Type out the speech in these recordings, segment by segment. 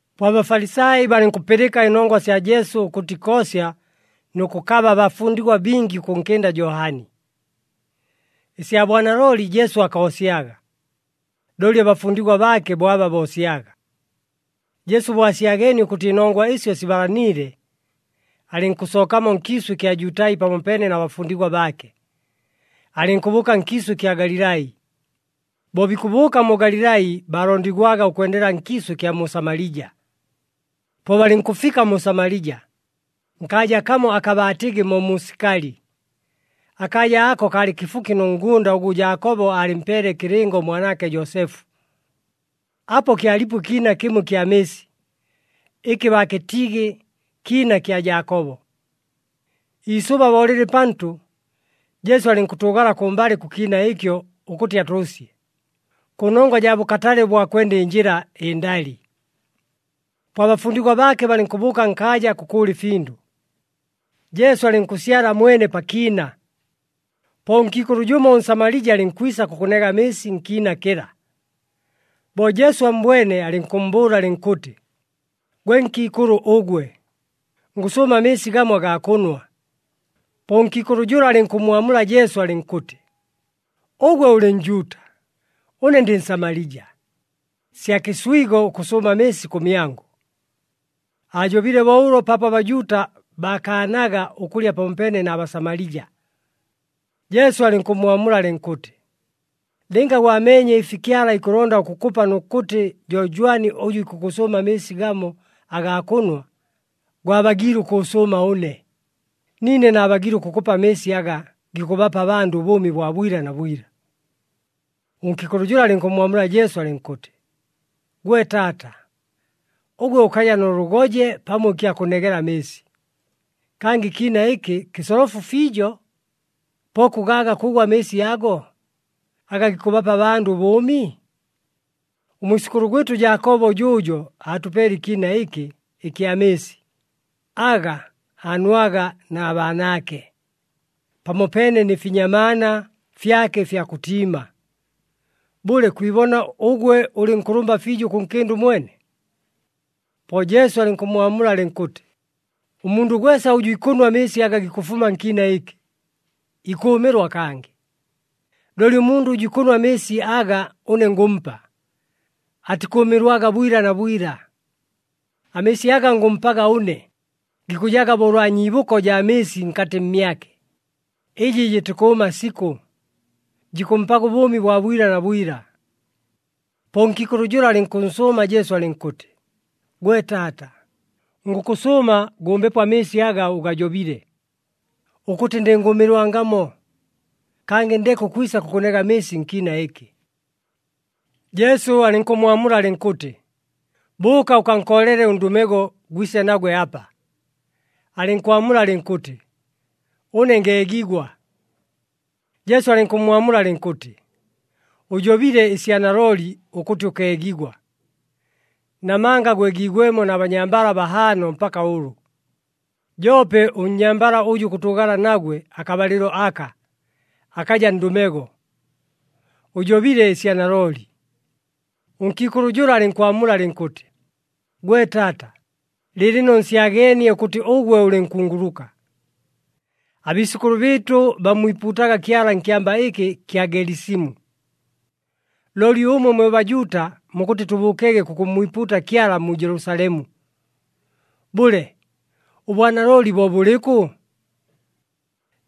Po aBafalisai balɨnkʉpɨlɨka ɨnongwa sya Jesu ʉkʉtɨ ikoosya nʉ kʉkaba abafundigwa bingi ʉkʉnkɨnda Johani. Ɨsya bwanalooli, Jesu akoosyaga, looli abafundigwa baake bo aba boosyaga. Jesu bo asyageenie ʉkʉtɨ ɨnongwa ɨsyo sibalaniile, alɨnkʉsookamo nkiisʉ ɨkya Jutai pamopeene na bafundigwa baake, alɨnkʉbʉʉka nkiisʉ ɨkya Galilai. Bo bikʉbʉʉka mu Galilai, baalondigwaga ʉkwendela nkiisʉ ɨkya mu Samalija. Po balɨnkʉfika mu Samalija, nkaaja kamo aka baatɨgɨ mo mu Sikali. Akaaja ako kaalɨ kɨfuki nʉ ngʉnda ʉgʉ Jaakobo aalɨmpeele ɨkɨlɨngo ʉmwanaake, Joosefu. Apo kyalipo ɨkiina kɨmo ɨkya mɨɨsi ɨkɨ baakɨtɨgɨ kiina kya Jaakobo. Iisʉba bo lɨlɨ pantʉ, Jesu alɨnkʉtʉʉgala kʉmbalɨ kʉ kiina ɨkyo ʉkʉtɨ atʉʉsye, kʉnongwa jaa bʉkatale ʉbwa kwenda ɨnjɨla ɨndali. Po abafundigwa baake balɨnkʉbʉʉka nkaaja kʉkʉʉla ɨfindʉ, Jesu alɨnkʉsyala mwene pa kiina. Po ʉnkiikʉlʉ jʉmo ʉNsamalija alɨnkwisa kʉkʉnega amɨɨsi nkiina kɨla. Bo Jesu ammbwene, alɨnkʉmmbʉʉla alɨnkʉtɨ, “Gwe nkiikʉlʉ ʉgwe, ngʉsʉʉma amɨɨsi gamo agaa kʉnwa.” Po ʉnkiikʉlʉ jʉla alɨnkʉmmwamula Jesu alɨnkʉtɨ, “Ʉgwe ʉlɨ Njuuta, ʉne ndɨ Nsamalija. Sya kɨswigo ʉkʉsʉʉma amɨɨsi kʉmyangʉ.” Aajobile bo ʉlo paapo aBajuuta baakaanaga ʉkʉlya pamopeene na Basamalija. Jesu alɨnkʉmmwamula alɨnkʉtɨ, “Lɨnga gwameenye ɨfi Kyala ikʉlonda ʉkʉkʉpa nʉ kʉtɨ jo jwani ʉjʉ ikʉkʉsʉʉma amɨɨsi gamo agaa kʉnwa, gwabagiile ʉkʉʉsʉʉma ʉne, niine naabagiile ʉkʉkʉpa amɨɨsi aga gikʉbapa abandʉ ʉbʉʉmi bwa bwila na bwila.” Ʉnkiikʉlʉ jʉla alɨnkʉmmwamula Jesu alɨnkʉtɨ, “Gwe taata, ʉgwe ʉkaja nʉ lʉgoje pamo ɨkya kʉnegela amɨɨsi, kangɨ ɨkiina ɨkɨ kɨsolofu fiijo, po kʉgaaga kʉʉgʉ amɨɨsi ago, aga gikʉbapa abandʉ ʉbʉʉmi? Ʉmwisʉkʉlʉ gwɨtʉ Jaakobo jʉʉjo aatʉpeele ɨkiina ɨkɨ ɨkya mɨɨsi, aga aanwaga na baanaake, pamopeene nɨ finyamaana fyake ɨfya kʉtiima. Bʉle, kwibona ʉgwe ʉlɨ nkʉlʉmba fiijo ʉkʉnkɨnda ʉmwene?” Po Jesu alɨnkʉmmwamula alɨnkʉtɨ, “Ʉmundʉ gwesa ʉjʉ ikʉnwa amɨɨsi aga gikʉfuma nkiina ɨkɨ, ikʉʉmɨlwa kangɨ. Looli ʉmundʉ ʉjʉ ikʉnwa amɨɨsi aga ʉne ngʉmpa, atikʉʉmɨlwaga bwila na bwila. Amɨɨsi aga ngʉmpaga ʉne gikʉjaga bo ʉlwa nyiibʉko jaa mɨɨsi nkatɨ mmyake, ɨjɨ jɨtikʉʉma sikʉ, jikʉmpaga ʉbʉʉmi bwa bwila na bwila.” Po ʉnkiikʉlʉ jʉla alɨnkʉnsʉʉma Jesu alɨnkʉtɨ, “Gwe taata, ngʉkʉsʉʉma gʉmbepo amɨɨsi aga ʉgajobile, ʉkʉtɨ ndɨngʉʉmɨlwangamo, kangɨ ndeke ʉkwisa kʉkʉnega amɨɨsi nkiina ɨkɨ!” Jesu alɨnkʉmmwamula alɨnkʉtɨ, “Bʉʉka ʉkankoolele ʉndʉmego, gwise nagwe apa.” Alɨnkwamula alɨnkʉtɨ, “Ʉne ngeegigwa.” Jesu alɨnkʉmmwamula alɨnkʉtɨ, “Ʉjobile ɨsya nalooli ʉkʉtɨ ʉkeegigwa! Namanga gwegiigwemo na banyambala bahaano mpaka ʉlʉ, joope ʉnnyambala ʉjʉ kʉtʉʉgala nagwe akabalɨlo aka, akaja ndʉmego. Ʉjobile ɨsya nalooli.” Ʉnkiikʉlʉ jʉla alɨnkwamula alɨnkʉtɨ, “Gwe taata, lɨɨlɨno nsyageenie ʉkʉtɨ ʉgwe ʉlɨ nkunguluka. Abiisʉkʉlʉ bɨɨtʉ bammwipuutaga Kyala nkyamba ɨkɨ ɨkya Gelisimu, looli ʉmwe mwe Bajuuta mukʉtɨ tʉbʉʉkege kʉkʉmmwipuuta Kyala mu Jelusalemu. Bʉle, ʉbwanalooli bo bʉlɨkʉ?”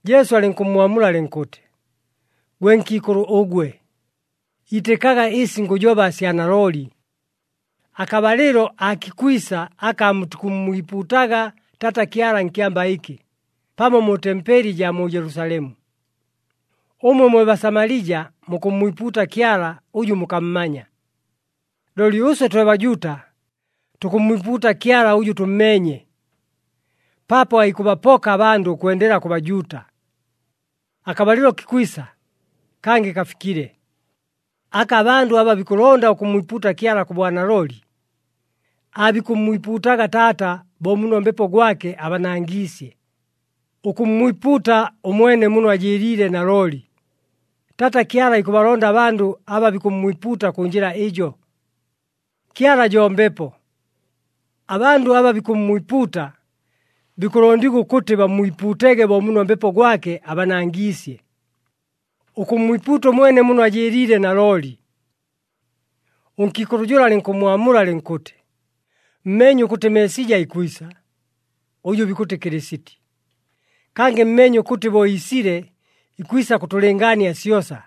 Jesu alɨnkʉmmwamula alɨnkʉtɨ, “Gwe nkiikʉlʉ ʉgwe, itɨkaga ɨsi ngʉjoba sya nalooli. Akabalɨlo aakikwisa aka aamutikʉmmwipuutaga Taata Kyala nkyamba ɨkɨ pamo mu tempeli ɨjaa mu Jelusalemu. Ʉmwe mwe Basamalija mukʉmmwipuuta Kyala ʉjʉ mukammanya, looli ʉswe twe Bajuuta tukʉmmwipuuta Kyala ʉjʉ tʉmmeenye. Paapo aikʉbapoka abandʉ ʉkwendela kʉ Bajuuta. Akabalɨlo kikwisa, kangɨ kafikile, aka abandʉ aba bikʉlonda ʉkʉmmwipuuta Kyala kʉ bwanalooli, aabikʉmmwipuutaga Taata bo muno Mbepo gwake abanangiisye, ʉkʉmmwipuuta ʉmwene muno ajɨɨliile nalooli. Taata Kyala ikʉbalonda abandʉ aba bikʉmmwipuuta kʉ njɨla ɨjo. Kyala jo Mbepo. Abandʉ aba bikʉmmwipuuta, bikʉlondigwa ʉkʉtɨ bammwipuutege bo muno Mbepo gwake abanangiisye, ʉkʉmmwipuuta ʉmwene muno ajɨɨliile nalooli.” Ʉnkiikʉlʉ jʉla alɨnkʉmmwamula alɨnkʉtɨ, “Mmeenye ʉkʉtɨ Meesija ikwisa, ʉjʉ bikʉtɨ Kɨlɨsiti. Kangɨ mmeenye ʉkʉtɨ bo iisile ikwisa kʉtʉlɨngaania syosa.”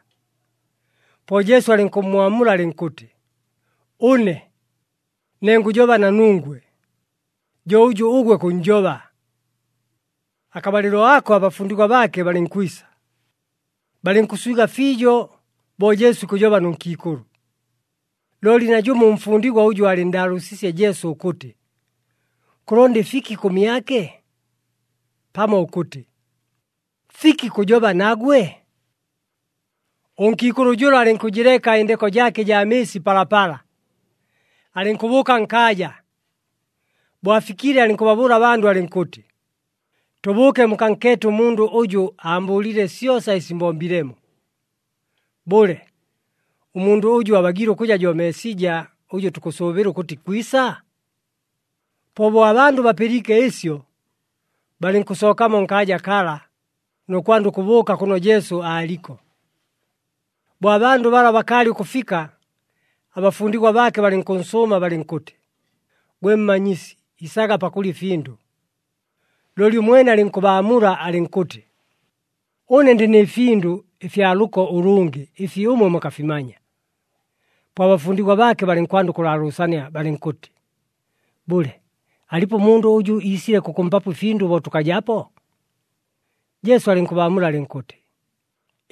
Po Jesu alɨnkʉmmwamula alɨnkʉtɨ, “Ʉne, ne ngʉjoba na nungwe, jo ʉjʉ ʉgwe kʉnnjoba.” Akabalɨlo ako abafundigwa baake balɨnkwisa, balɨnkʉswiga fiijo bo Jesu ikʉjoba nʉ nkiikʉlʉ. Looli najʉmo ʉmfundigwa ʉjʉ aalɨnndaalʉʉsiisye Jesu ʉkʉtɨ, “Kʉlonda ɨfiki kʉmyake?” pamo ʉkʉtɨ, “Fiki kʉjoba nagwe?” Ʉnkiikʉlʉ jʉla alɨnkʉjɨleka ɨndeko jaake ɨjaa mɨɨsi palapala, alɨnkʉbʉʉka nkaaja. Bo afikile alɨnkʉbabʉʉla abandʉ alɨnkʉtɨ, “Tʉbʉʉke mukankeete ʉmundʉ ʉjʉ aambʉʉlile syosa ɨsi mbombilemo. Bʉle, ʉmundʉ ʉjo abagiile ʉkʉja jo Meesija ʉjʉ tukʉsʉʉbɨla ʉkʉtɨ ikwisa?” Po bo abandʉ bapɨliike ɨsyo, balɨnkʉsookamo nkaaja kala, nʉ kwanda ʉkʉbʉʉka kʉno Jesu aaliko. Bo abandʉ bala bakaalɨ ʉkʉfika, abafundigwa baake balɨnkʉnsʉʉma balɨnkʉtɨ, “Gwe Mmanyisi, isaga pakʉlya ɨfindʉ.” Looli ʉmwene alɨnkʉbaamula alɨnkʉtɨ, “Ʉne ndɨ nɨ findʉ ɨfya lʉko ʉlʉngɨ ɨfi ʉmwe mukafimanya.” Po abafundigwa baake balɨnkwanda ʉkʉlaalʉʉsania balɨnkʉtɨ, “Bʉle, alipo ʉmundʉ ʉjʉ iisile kʉkʉmpapo ɨfindʉ bo tʉkajapo?” Jesu alɨnkʉbaamula alɨnkʉtɨ,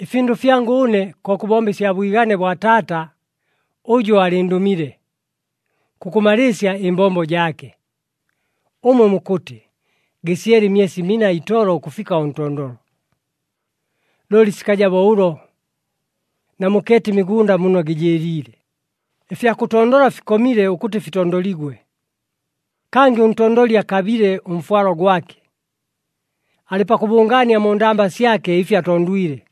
“Ɨfindʉ fyangʉ ʉne ko kʉbomba ɨsya bwigane bwa Taata ʉjʉ aalɨndʉmile, kʉkʉmalɨɨsya ɨmbombo jaake. Ʉmwe mukʉtɨ, ‘Gɨsyele ɨmyesi mina itolo ʉkʉfika ʉntondolo.’ Looli sikaja bo ʉlo! Namukeete ɨmigʉnda muno gɨjɨɨliile. Ɨfya kʉtondola fikomile ʉkʉtɨ fitondoligwe. Kangɨ ʉntondoli akabile ʉmfwalo gwake. Alɨ pakʉbʉngaania mu ndamba syake ɨfi atondwile,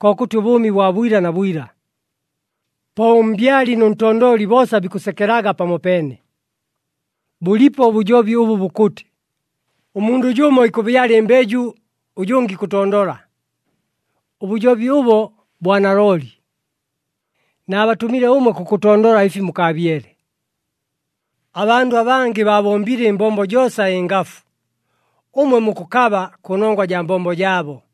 kokʉtɨ ʉbʉʉmi bwa bwila na bwila. Po ʉmbyali nʉ ntondoli boosa bikʉsekelaga pamopeene. Bʉlipo ʉbʉjobi ʉbʉ bukʉtɨ, ‘Ʉmundʉ jʉmo ikʉbyala ɨmbeju, ʉjʉngɨ ikʉtondola.’ Ʉbʉjobi ʉbo bwa nalooli. Naabatʉmile ʉmwe kʉkʉtondola ɨfi mukaabyele. Abandʉ abangɨ baabombile ɨmbombo joosa ɨngafu, ʉmwe mukʉkaba kʉnongwa jaa mbombo jaabo.”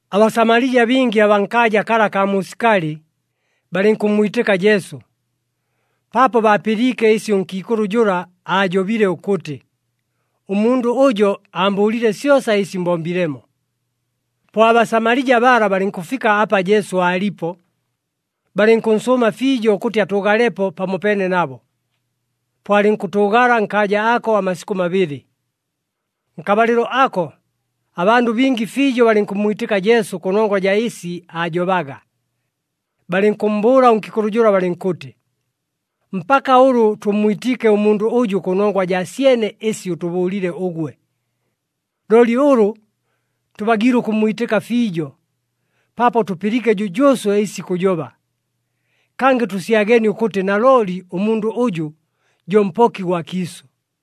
ABasamalija bingi abaa nkaaja kala akaa mu Sikali, balɨnkʉmmwitɨka Jesu, paapo baapɨliike ɨsi ʉnkiikʉlʉ jʉla aajobile ʉkʉtɨ, “Ʉmundʉ ʉjo aambʉʉlile syosa ɨsi mbombilemo.” Po aBasamalija bala balɨnkʉfika apa Jesu aalipo, balɨnkʉnsʉʉma fiijo ʉkʉtɨ atʉʉgalepo pamopeene nabo. Po alɨnkʉtʉʉgala nkaaja ako amasikʉ mabɨlɨ. Nkabalɨlo ako, abandʉ bingi fiijo balɨnkʉmmwitɨka Jesu kʉnongwa jaa ɨsi aajobaga. Balɨnkʉmmbʉʉla ʉnkiikʉlʉ jʉla balɨnkʉtɨ, “Mpaka ʉlʉ tʉmmwitiike ʉmundʉ ʉjʉ kʉnongwa jaa syene ɨsi ʉtʉbʉʉlile ʉgwe. Looli ʉlʉ tʉbagiile ʉkʉmmwitɨka fiijo, paapo tʉpɨliike jʉjʉʉswe ɨsi ikʉjoba. Kangɨ tʉsyageenie ʉkʉtɨ nalooli ʉmundʉ ʉjʉ jo Mpoki gwa kiisʉ.”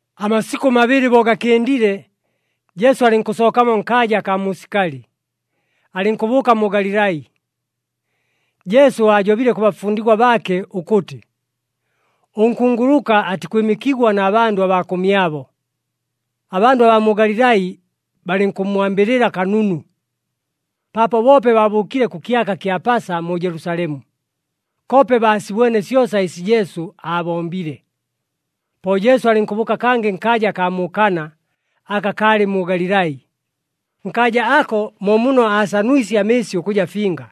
Amasikʉ mabɨlɨ bo gakɨndile, Jesu alɨnkʉsookamo nkaaja akaa mu Sikali, alɨnkʉbʉʉka mu Galilai. Jesu aajobile kʉ bafundigwa baake ʉkʉtɨ, ʉnkunguluka atikwɨmɨkigwa na bandʉ abaa kʉmyabo. Abandʉ abaa mu Galilai balɨnkʉmmwambɨlɨla kanunu, paapo boope baabʉʉkile kʉ kyaka kya Pasa mu Jelusalemu, koope baasibwene syosa ɨsi Jesu aabombile. Po Jesu alɨnkʉbʉʉka kangɨ nkaaja akaa mu Kana aka kalɨ mu Galilai. Nkaaja ako mo muno aasanwisye amɨɨsi ʉkʉja finga.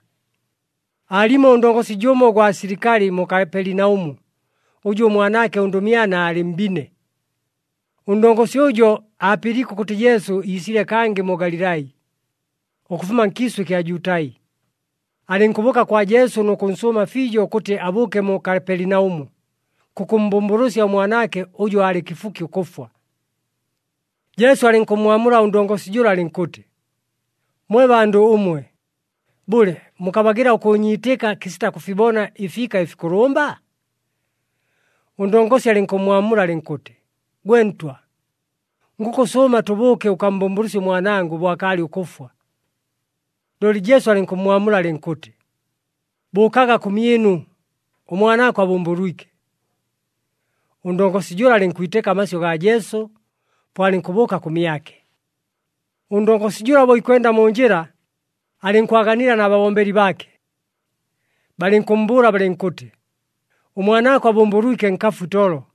Aalimo ʉndongosi jʉmo ʉgwa silikali mu Kapelinaʉmu ʉjʉ ʉmwanaake ʉndʉmyana aalɨ mbine. Ʉndongosi ʉjo aapɨliike ʉkʉtɨ Jesu iisile kangɨ mu Galilai, ʉkʉfuma nkiisʉ ɨkya Jutai. Alɨnkʉbʉʉka kwa Jesu nʉ kʉnsʉʉma fiijo ʉkʉtɨ abʉʉke mu Kapelinaʉmu, kʉkʉmmbʉmbʉlʉsya ʉmwanaake, ʉjʉ aalɨ kɨfuki ʉkʉfwa. Jesu alɨnkʉmmwamula ʉndongosi jʉla alɨnkʉtɨ, “Mwe bandʉ ʉmwe, bʉle, mukabagɨla ʉkʉʉnyiitɨka kɨsita kʉfibona ɨfiika ɨfikʉlʉmba?” Ʉndongosi alɨnkʉmmwamula alɨnkʉtɨ, “Gwe Ntwa, ngʉkʉsʉʉma, tʉbʉʉke ʉkammbʉmbʉlʉsye ʉmwanangʉ bo akaalɨ ʉkʉfwa.” Looli Jesu alɨnkʉmmwamula alɨnkʉtɨ, “Bʉʉkaga kʉmyɨnu, ʉmwanaako abʉmbʉlwike.” Ʉndongosi jʉla alɨnkwitɨka amasyʉ gaa Jesu, po alɨnkʉbʉʉka kʉmyake. Ʉndongosi jʉla bo ikwenda mu njɨla, alɨnkwaganila na babombeli baake. Balɨnkʉmmbʉʉla balɨnkʉtɨ, “Ʉmwanaako abʉmbʉlwike, nkafu itolo.”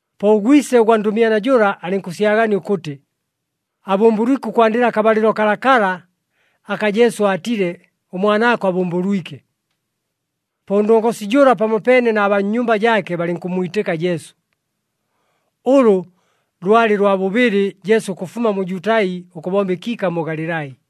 Po ʉgwise ʉgwa ndʉmyana jʉla alɨnkʉsyagania ʉkʉtɨ abʉmbʉlwike ʉkwandɨla akabalɨlo kalakala aka Jesu aatile, “Ʉmwanaako abʉmbʉlwike.” Po ʉndongosi jʉla pamopeene na baa nnyumba jaake balɨnkʉmmwitɨka Jesu. Ʉlʉ lwalɨ lwa bʉbɨlɨ Jesu ʉkʉfuma mu Jutai ʉkʉbomba ɨkiika mu Galilai.